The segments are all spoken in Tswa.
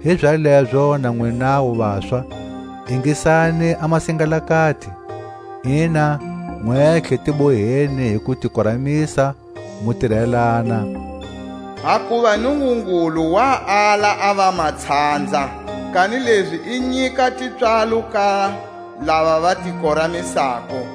Hizalezo na nwinawu vaswa, ingisani a masingalakati. Ina, nwentlhe ti boheni hi kutikoramisa, mu tirelana; hakuva Nungungulu wa ala a vamatshanza, kanilezi i nyika tipswalo ka lava va ti koramisako.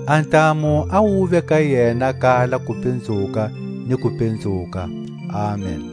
A ntamu a wuve ka yena kala kupinzuka ni kupinzuka. Amen.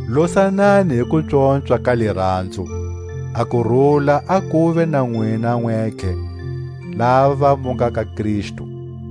Losanani hi kupswopswa ka Liranzo. A kurula a kuve na nwina nwentlhe lava mu nga ka Kristu.